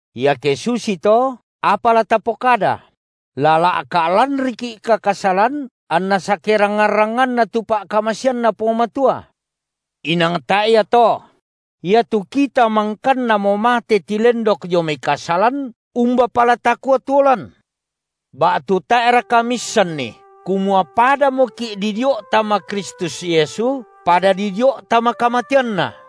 Iake susito apa la tapokada? La la’ka’ lanriki’ka kasalan, anna sakerangngan-rangnganna tu pa’kamaseanNa Puang Matua? Inang tae’ ia to! Iatu kita mangkannamo mate tilendok dio mai kasalan, umbapa la takua tuo lan? Ba’tu tae’raka miissanni kumua padamoki’ didio’ tama Kristus Yesu, pada didio’ tama kamateanNa?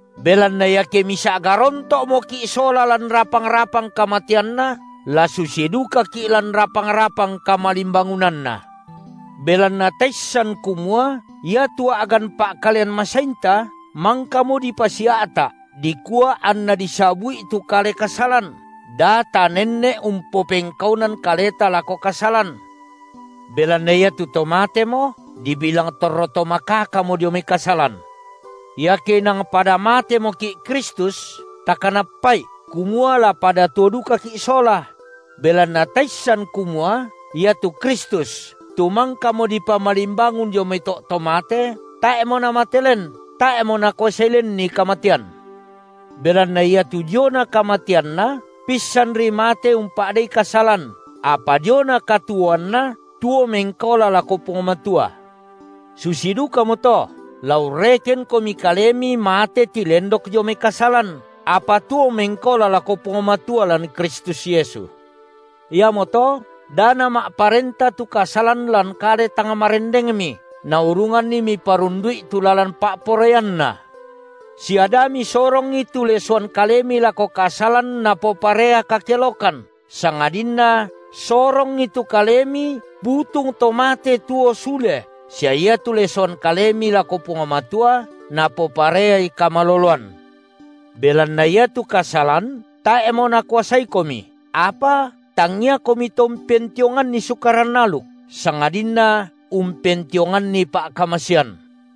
Belanna iake misa’ garonto’moki’ sola lan rapang-rapang kamateanNa, la susi dukaki’ lan rapang-rapang kamalimbangunanNa. Belanna taissan kumua iatu a’gan pa’kalean masainta mangkamo dipasia’ta’ dikua anna disabu’i tu kale kasalan, da tanenne’ umpopengkaunan kaleta lako kasalan; belanna iatu to matemo, dibilang torro to makakamo dio mai kasalan. Iake inang pada matemoki’ Kristus, takanappa’i kumua la pada tuo dukaki’ sola; belanna taissan kumua iatu Kristus, tu mangkamo dipamalimbangun dio mai to’ to mate, tae’mo Namate len; tae’mo nakuasai lenNi kamatean. Belanna iatu diona kamateanNa, pissanri mate umpa’dei kasalan, apa diona katuoanNa, tuo mengkaola lako Puang Matua. Susi dukamoto la urrekenkomi kalemi mate tilendok dio mai kasalan, apa tuo mengkaola lako Puang Matua lan Kristus Yesu. Iamoto da nama’parenta tu kasalan lan kale tang marendengmi, naurunganni miparundu’i tu lalan pa’poraianna, sia da misorongi tu lesoan kalemi lako kasalan napoparea kakelokan, sangadinna sorongi tu kalemi butung to mate tuo sule, sia iatu lesoan kalemi lako Puang Matua napopareai kamaloloan. Belanna iatu kasalan tae’mo nakuasaikomi, apa tangiakomi to umpentionganni Sukaran aluk, sangadinna umpentionganni pa’kamasean.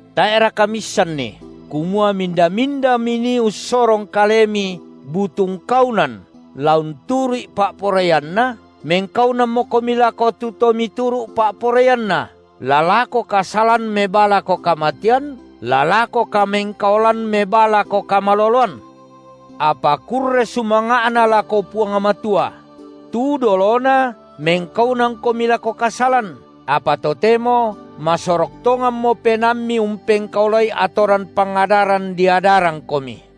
Tae’raka miissanni, kumua minda-minda minii ussorong kalemi butung kaunan la unturu’i pa’poraianna, mengkaunanmokomi lako tu to mituru’ pa’poraianna, la lako kasalan mebaa lako kamatean, la lako kamengkaolan mebaa lako kamaloloan? Apa kurre sumanga’na lako Puang Matua: tu dolona mengkaunankomi lako kasalan, apa totemo masorok tonganmo penaammi umpengkaolai atoran pangadaran diadarangkomi.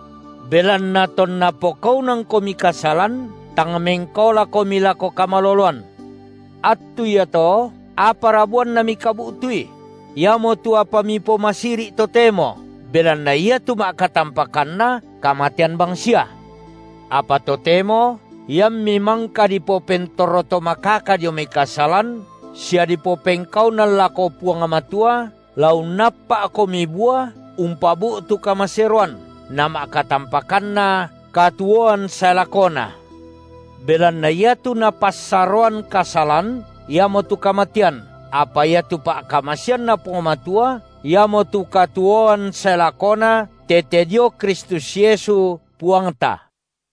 Belanna tonna pokaunankomi kasalan, tang mengkaolakomi lako kamaloloan. Attu iato, apara buanna mikabu’tui? Iamotu apa mipomasiri’ totemo, belanna iatu ma’katampakanna kamatean bangsia. Apa totemo iammi mangka dipopentorro to makaka dio mai kasalan, sia dipopengkaunan lako Puang Matua, la unnappa’komi bua umpabu’tu kamaseroan, nama’katampakanna katuoan sae lakona. Belanna iatu napassaroan kasalan iamotu kamatean, apa iatu pa’kamaseanNa Puang Matua, iamotu katuoan sae lakona tete dio Kristus Yesu, Puangta.